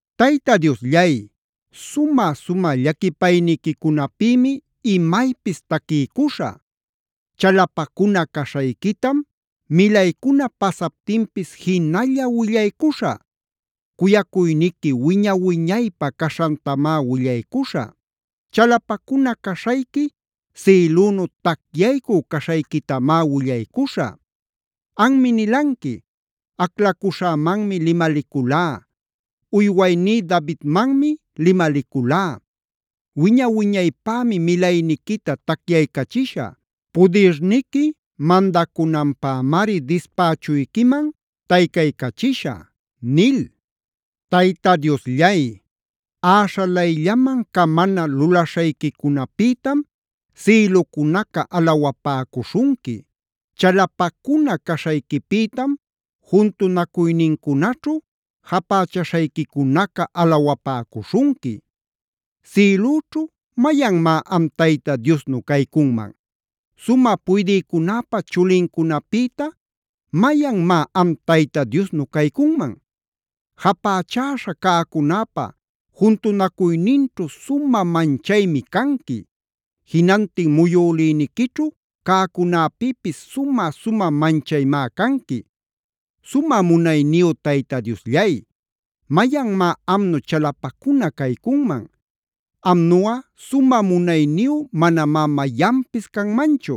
Tayta Diosllay, sumä-sumä llaquipayniquicunapïmi imaypis taquiycuśhä. Chalapacuna caśhayquitam milaycuna pasaptinpis jinalla willaycuśhä. Cuyacuyniqui wiña-wiñaypä caśhantamá willacuśhä. Chalapacuna caśhayqui sïlünu tacyaycü caśhayquitamá willaycuśhä. Anmi nilanqui: “Aclacuśhämanmi limaliculá. Uywayní Davidmanmi limaliculá: ‘Wiña-wiñaypämi milayniquita tacyaycachishä. Pudirniqui mandacunanpämari dispächuyquiman taycaycachishä’”a nil. Tayta Diosllay, äśhalayllaman camana lulaśhayquicunapïtam sïlucunaca alawapäcuśhunqui. Chalapacuna caśhayquipïtam juntunacuynincunaćhu japächaśhayquicunaca alawapäcuśhunqui. Sïlüćhu ¿mayanmá am Tayta Diosnu caycunman? Sumä puydïcunäpa chulincunapïta ¿mayanmá am Tayta Diosnu caycunman? Japächäśha cäcunäpa juntunacuyninćhu sumä manchaymi canqui. Jinantin muyülïniquićhu cäcunäpïpis sumä-sumä manchaymá canqui. Sumä munayniyu Tayta Diosllay, ¿mayanmá amnu chalapacuna caycunman? Amnuꞌa sumä munayniyu manamá mayanpis canmanchu.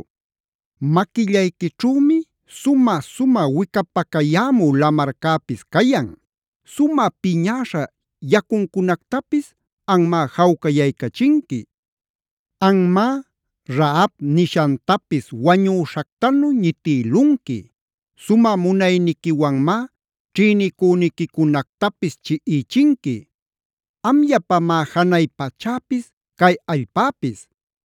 Maquillayquićhümi sumä-sumä wicapacayämü lamarcäpis cayan. Sumä piñäśha yacuncunactapis anmá jawcayaycachinqui. Anmá Rahab nishantapisb wañüśhactanu ñitïlunqui.c Sumä munayniquiwanmá ćhinicüniquicunactapis chiꞌichinqui. Amllapamá janay pachäpis cay allpäpis.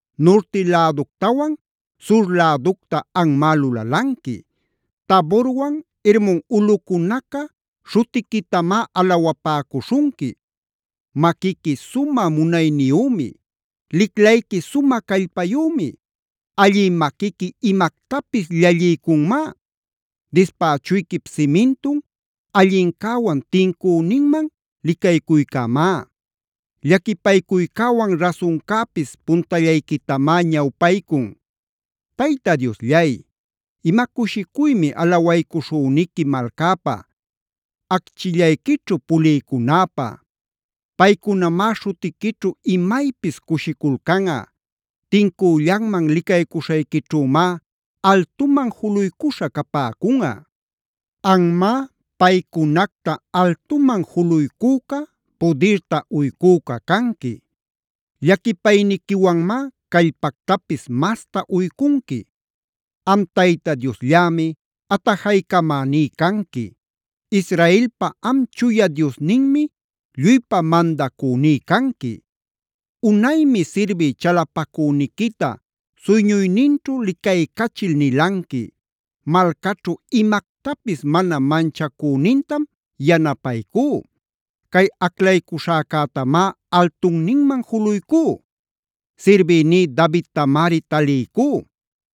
Nurti läductawan sur läducta anmá lulalanqui. Taborwan Hermon ulꞌucunaca śhutiquitamá alawapäcuśhunqui. Maquiqui sumä munayniyümi. Liclayqui sumä callpayümi; allï maquiqui imactapis llalliycunmá. Dispächuyquip simintun allincäwan tincüninman licaycuycämá. Llaquipaycuycäwan rasuncäpis puntallayquitamá ñawpaycun. Tayta Diosllay, ¡ima cushicuymi alawaycuśhüniqui malcapä, acchillayquićhu pulïcunäpä! Paycunamá śhutiquićhu imaypis cushiculcanꞌa. Tincüllanman licaycuśhayquićhümá altuman juluycuśha capäcunꞌa. Anmá paycunacta altuman juluycüca, pudirta uycüca canqui. Llaquipayniquiwanmá callpactapis masta uycunqui. Am Tayta Diosllämi atajaycamäní canqui. Israelpa am Chuya Diosninmi lluypa mandacüní canqui. Unaymi sirbï chalapacüniquita suyñuyninćhu licaycachil nilanqui: “Malcaćhu imactapis mana manchacünintam yanapaycú. Cay aclaycuśhäcätamá altunninman juluycú. Sirbïní Davidtamari taliycú.e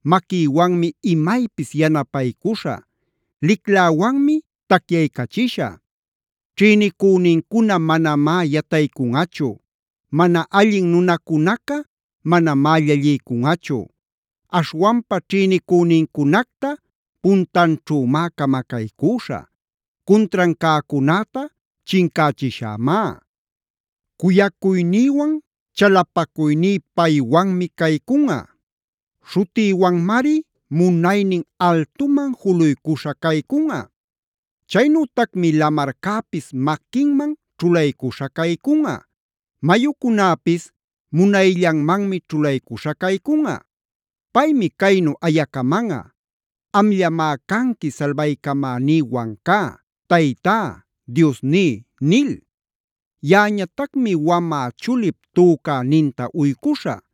Maquïwanmi imaypis yanapaycuśhä. Licläwanmi tacyaycachishä. Ćhïnicünincuna manamá yataycunꞌachu. Mana allin nunacunaca manamá llalliycunꞌachu. Aśhwanpa ćhïnicünincunacta puntanćhümá camacaycüśhä. Cuntran cäcunäta chincächishämá. Cuyacuynïwan chalapacuyní paywanmi caycunꞌa. Śhutïwanmari munaynin altuman juluycuśha caycunꞌa. Chaynütacmi lamarcäpis maquinman ćhulaycuśha caycunꞌa. Mayucunäpis munayllanmanmi ćhulaycuśha caycunꞌa. Paymi caynu ayacamanꞌa: ‘Amllamá canqui salbaycamäní Wancá, Taytá, Diosní’ nil. Yaꞌañatacmi wamä chulip tücäninta uycuśhä.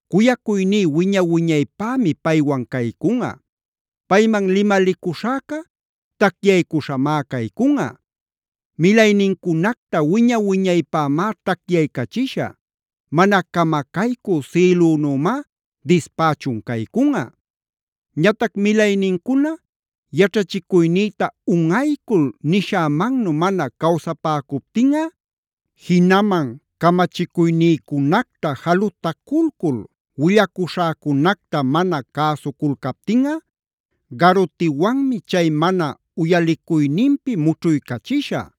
Cuyacuyní wiña-wiñaypämi paywan caycunꞌa. Payman limalicuśhäca tacyaycuśhamá caycunꞌa. Milaynincunacta wiña-wiñaypämá tacyaycachishä. Mana camacaycü sïlünümá dispächun caycunꞌa. “Ñatac milaynincuna yaćhachicuynïta unꞌaycul nishämannu mana cawsapäcuptinꞌa, jinaman camachicuynïcunacta jalutaculcul willacuśhäcunacta mana cäsuculcaptinꞌa, garutiwanmi chay mana uyaliycuyninpi mućhuycachishä.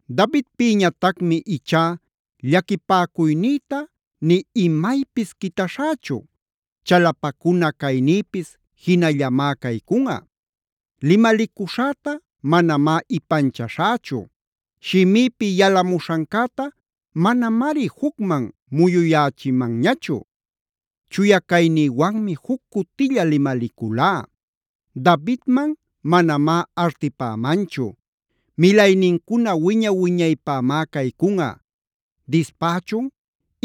Davidpïñatacmi ichá llaquipäcuynïta nï imaypis quitaśhächu. Chalapacuna caynïpis jinallamá caycunꞌa. Limalicuśhäta manamá ipanchaśhächu. Shimïpi yalamuśhancäta manamari jucman muyuyächïmanñachu. Chuya caynïwanmi juc cutilla limaliculá. Davidman manamá artipämanchu. Milaynincuna wiña-wiñaypämá caycunꞌa. Dispächun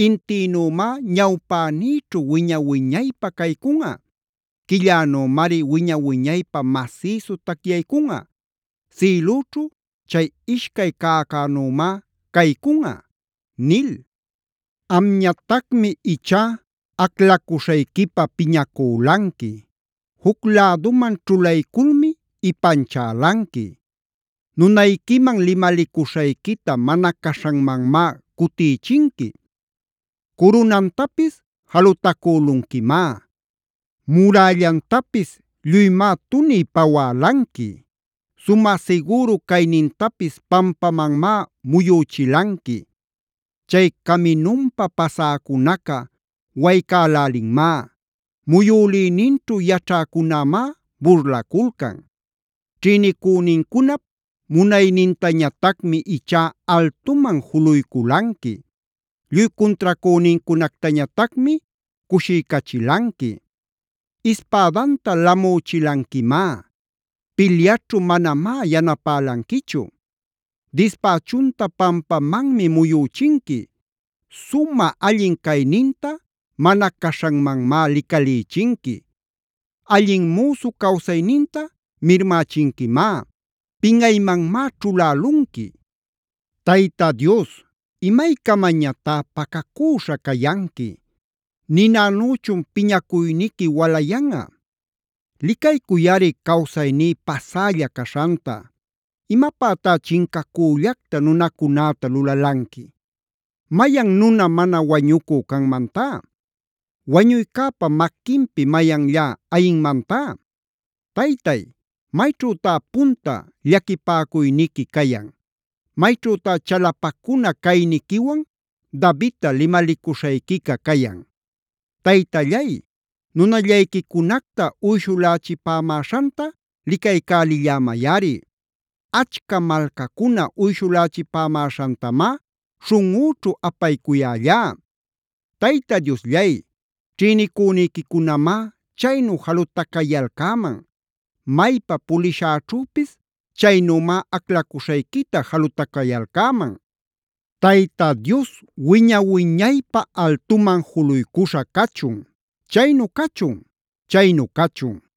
intïnümá ñawpänïćhu wiña-wiñaypä caycunꞌa. Quillänümari wiña-wiñaypä masïsu tacyaycunꞌa. Sïlüćhu chay ishcay cäcänümá caycunꞌa” nil. Amñatacmi ichá aclacuśhayquipä piñacülanqui. Juc läduman ćhulayculmi ipanchälanqui. Nunayquiman limalicuśhayquita mana caśhanmanmá cutïchinqui. Curunantapis jalutacülunquimá. Murällantapis lluymá tuniy pawälanqui. Sumä sigüru caynintapis pampamanmá muyüchilanqui. Chay caminunpa pasäcunaca waycälälinmá. Muyülïninćhu yaćhäcunämá burlaculcan. Ćhïnicünincunap munaynintañatacmi ichá altuman juluyculanqui. Lluy cuntracünincunactañatacmi cushiycachilanqui. Ispädanta lamüchilanquimá. Pilyaćhu manamá yanapälanquichu. Dispächunta pampamanmi muyüchinqui. Sumä allin cayninta mana caśhanmanmá licalïchinqui. Allin müsu cawsayninta mirmächinquimá. ¡Pinꞌaymanmá ćhulälunqui! Tayta Dios, ¿imaycamañatá pacacüśha cayanqui? ¿Ninanüchun piñacuyniqui walayanꞌa? Licaycuyꞌari cawsayní pasälla caśhanta. ¿Imapätá chincacüllacta nunacunäta lulalanqui? ¿Mayan nuna mana wañücü canmantá? ¿Wañuycäpa maquinpi mayanllá ayinmantá? Taytay, ¿mayćhütá punta llaquipäcuyniqui cayan? ¿Mayćhütá chalapacuna cayniquiwan Davidta limalicuśhayquica cayan? Taytallay, nunallayquicunacta uyshulächipämäśhanta licaycälillämayꞌari. Achca malcacuna uyshulächipämäśhantamá śhunꞌüćhu apaycuyällá. Tayta Diosllay, ćhïnicüniquicunamá chaynu jalutacayalcäman. Maypa pulishäćhüpis chaynümá aclacuśhayquita jalutacayalcäman. ¡Tayta Dios wiña-wiñaypä altuman juluycuśha cachun! Chaynu cachun; chaynu cachun.